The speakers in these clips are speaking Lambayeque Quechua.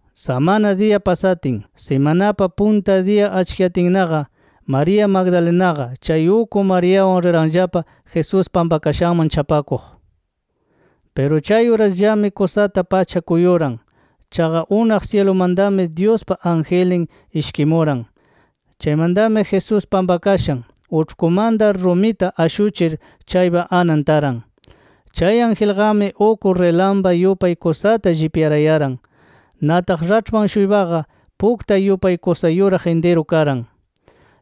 Samana diya pasatin, simanapa punta diyan achkiyatinnaqa María Magdalenaqa, chay uk Mariawan riranllapa Jesús pampakashanman chapakuq. Piru chay urasllami kusata pacha kuyuran. Chaqa unaq syilumantami Dyuspa angelnin ishkimuran. Chaymantami Jesús pampakashan uĉhkumanta rumita ashuchir chaypa anan taran. Chay angelqami uk rilampa yupay kusata llipyarayaran. Nataq raĉhpan-shuypaqa puktay yupay kusa yuraq intiru karan.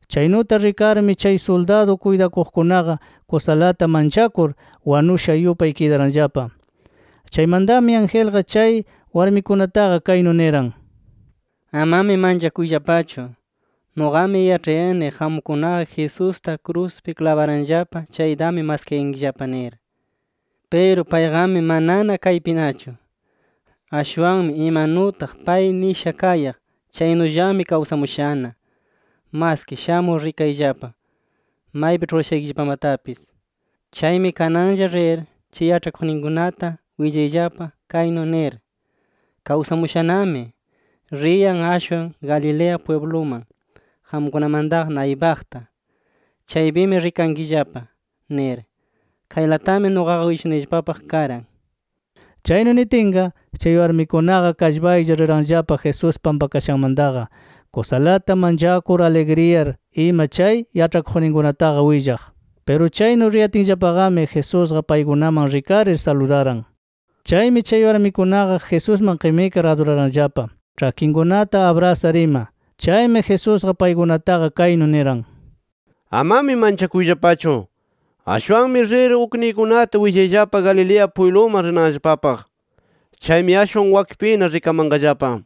Chaynuta rikarmi chay suldadu kuytakuqkunaqa kusalata manchakur, wanusha yupay kidaranllapa. Chaymantami angelqa chay warmikunataqa kaynu niran: “Amami manchakuyllapachu. Nuqami yaĉhayani qamkunaqa Jesusta kruspi klabaranllapa chaytami maskayankillapa nir. Piru payqami manana kaypinachu. Ashwanmi imanutaq pay nisha kayaq, chaynullami kawsamushana. Maski shamur rikayllapa maypi ĉhurashaykillapamatapis. Chaymi kananlla rir chay yaĉhakuqninkunata willayllapa kaynu nir: ‘Kawsamushanami, riyan ashwan Galilea pwibluman, qamkunamantaqa naypaqta. Chaypimi rikankillapa’ nir. Kaylatami nuqaqa willashunayllapapaq karan”. Chaynu nitinqa chay warmikunaqa kallpaylla riranllapa Jesús pampakashanmantaqa, kusalata manchakur, aligriyar, ima chay yaĉhakuqninkunataqa willaq. Piru chaynu riyatinllapaqami Jesusqa paykunaman rikarir, saludaran. Chaymi chay warmikunaqa Jesusman qimikar aduraranllapa, ĉhakinkunata abrasar ima. Chaymi Jesusqa paykunataqa kaynu niran: “Amami manchakuyllapachu. Ashwanmi rir ukniykunata willayllapa Galilea pwibluman rinanllapapaq. Chaymi ashwan wakpina rikamanqallapa” nir.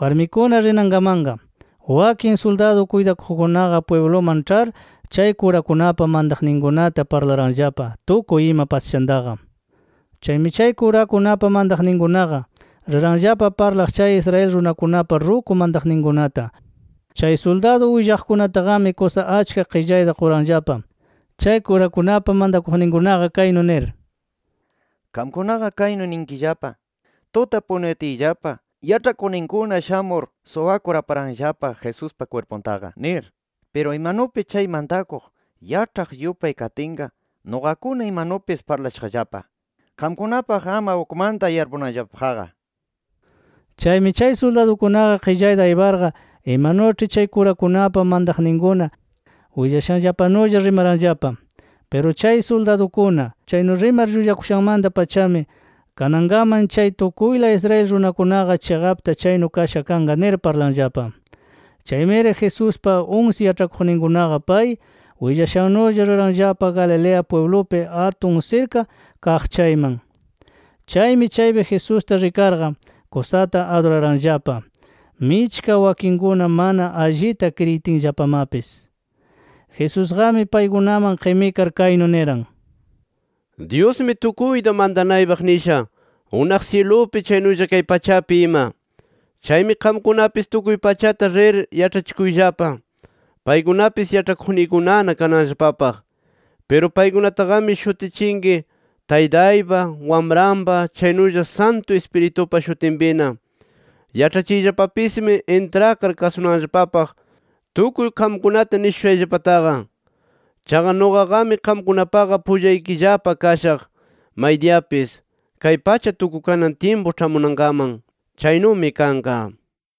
Warmikuna rinankamanqa, wakin suldadu kuytakuqkunaqa pwibluman ĉhar chay kurakunapa mantaqninkunata parlaranllapa tukuy ima pasashantaqa. Chaymi chay kurakunapa mantaqninkunaqa riranllapa parlaq chay Israel runakunapa ruku mantaqninkunata. Chay suldadu willaqkunataqami kusa achka qillayta quranllapa chay kurakunapa mantakuqninkunaqa kaynu nir: “Qamkunaqa kaynu ninkillapa: ‘Tuta punuyatiyllapa, yaĉhakuqninkuna shamur suwakur aparanllapa Jesuspa kwirpuntaqa’ nir. Piru imanupi chay mantakuq yaĉhaq yupay katinqa nuqakuna imanupis parlashaqllapa. Qamkunapaq ama ukmanta yarpunanllapapaqqa”. Chaymi chay suldadukunaqa qillayta ayparqa imanuĉhi chay kurakunapa mantaqninkuna willashanllapanulla rimaranllapa. Piru chay suldadukuna chaynu rimar llullakushanmanta-pachami, kanankaman chay tukuyla Israel runakunaqa chiqapta chaynu kasha kanqa nir parlanllapa. Chaymiri Jesuspa unsi yaĉhakuqninkunaqa pay willashannulla riranllapa Galilea pwiblupi atun sirka kaq chayman. Chaymi chaypi Jesusta rikarqa, kusata aduraranllapa, michka wakinkuna mana allita kriyitinllapamapis. Jesusqami paykunaman qimikar kaynu niran: “Dyusmi tukuyta mantanaypaq nisha, unaq syilupi chaynulla kay pachapi ima. Chaymi qamkunapis tukuy pachata rir yaĉhachikuyllapa. Paykunapis yaĉhakuqniykunana kananllapapaq. Piru paykunataqami shutichinki Taytaypa, Wamranpa, chaynulla Santu Ispiritupa shutinpina. Yaĉhachiyllapapismi intrakar kasunanllapapaq, tukuy qamkunata nishushayllapataqa. Chaqa nuqaqami, qamkunapaqa pullaykillapa kashaq maydiyapis, kay pacha tukukanan tyimpu ĉhamunankaman” nir. Chaynumi kanqa.